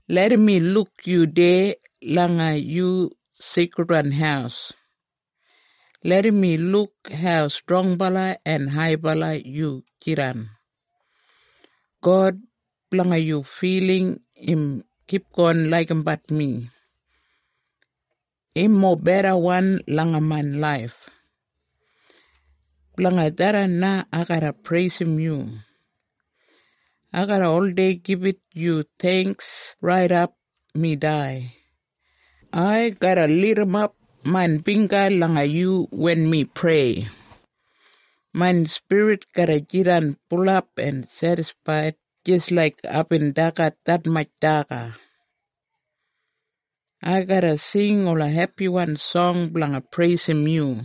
Larram mi luk yu deya langa yu seikridwan haus. Larram mi luk hau strongbala en haibala yu jidan. God, blanga yu filing im kipgon laigimbat mi. Im mobedawan langa main laif. Blanga tharran na ai garra preisim yu. Ai garra oldei gibit yu theingks raidap mi dai. Ai garra lidimap main bingga langa yu wen mi prei. Main spirit garra jidan bulap en sedisfaid jis laik aibin dagat detmatj daga. Ai garra sing ola hepiwan song blanga preisim yu.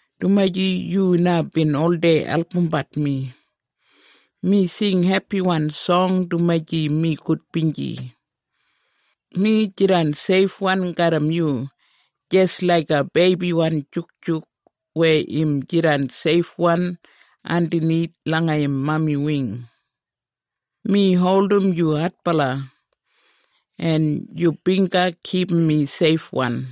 dumaji yu na bin oldei albumbat mi. Mi sing hepiwan song dumaji mi gudbinji. Mi jidan seifwan garram yu, jis laiga beibiwan jukjuk weya im jidan seifwan andanith langa im mami wing. Mi holdim yu adbala, en yu bingga kipum mi seifwan.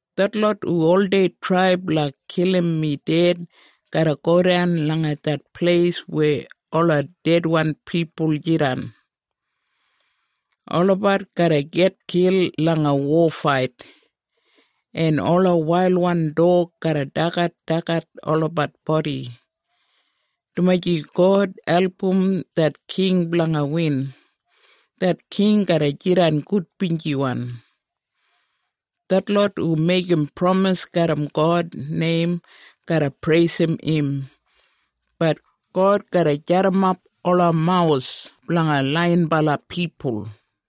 Detlot hu oldei trai blanga kilim mi ded garra godan langa det pleis weya ola dedwan pipul jidan. Olabat garra gitkil langa wofait, en ola wailwan dog garra dagadagat olabat bodi. Dumaji God album det king blanga win, det king garra jidan gudbinjiwan. Detlot hu meigim pramis garram God neim garra preisim im, bat God garra jadimap ola mawus blanga laiyinbala pipul.